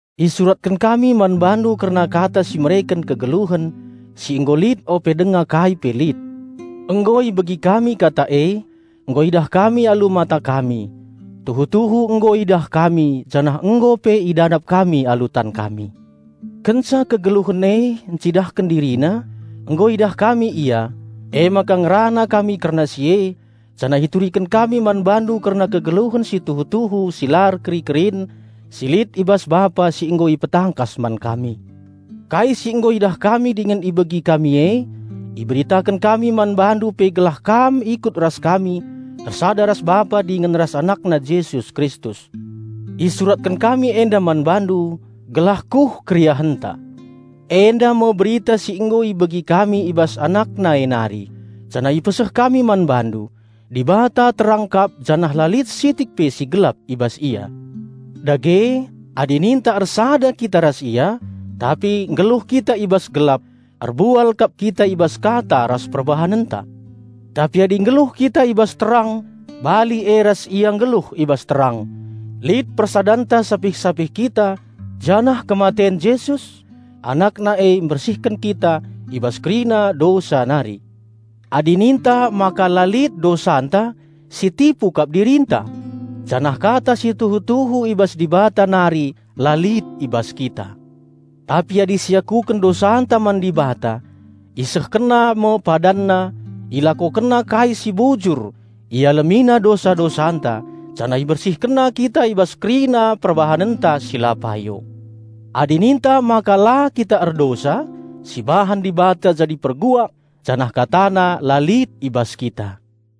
Isuratken kami man bandu kerna Kata si mereken kegeluhen, si nggo lit ope denga kai pe lit. Nggo ibegi kami Kata e, nggo idah kami alu mata kami; tuhu-tuhu nggo idah kami, janah nggo pe idadap kami alu tan kami. Kenca kegeluhen e ncidahken DiriNa, nggo idah kami Ia, emaka ngerana kami kerna si e, janah ituriken kami man bandu kerna kegeluhen si tuhu-tuhu si la erkeri-kerin si lit i bas Bapa si nggo ipetangkas man kami. Kai si nggo idah kami dingen ibegi kami e, iberitaken kami man bandu pe gelah kam ikut ras kami ersada ras Bapa dingen ras AnakNa Jesus Kristus. Isuratken kami enda man bandu gelah kuh keriahenta. Enda me berita si nggo ibegi kami i bas AnakNa e nari janah ipeseh kami man bandu: Dibata terang kap janah la lit sitik pe si gelap i bas Ia. Dage, adi ninta ersada kita ras Ia, tapi nggeluh kita i bas gelap, erbual kap kita i bas kata ras perbahanenta. Tapi adi nggeluh kita i bas terang bali e ras Ia nggeluh i bas terang; lit persadanta sapih-sapih kita janah kematen Jesus, AnakNa e mbersihken kita i bas kerina dosa nari. Adi ninta maka la lit dosanta, sitipu kap dirinta, janah Kata si tuhu-tuhu i bas Dibata nari la lit i bas kita. Tapi adi siakuken dosanta man Dibata, IsehkenNa me PadanNa, IlakokenNa kai si bujur, IalemiNa dosa-dosanta, janah IbersihkenNa kita i bas kerina perbahanenta si payo. Adi ninta maka la kita erdosa, perbual kap Dibata e sibahan, janah KataNa la lit i bas kita.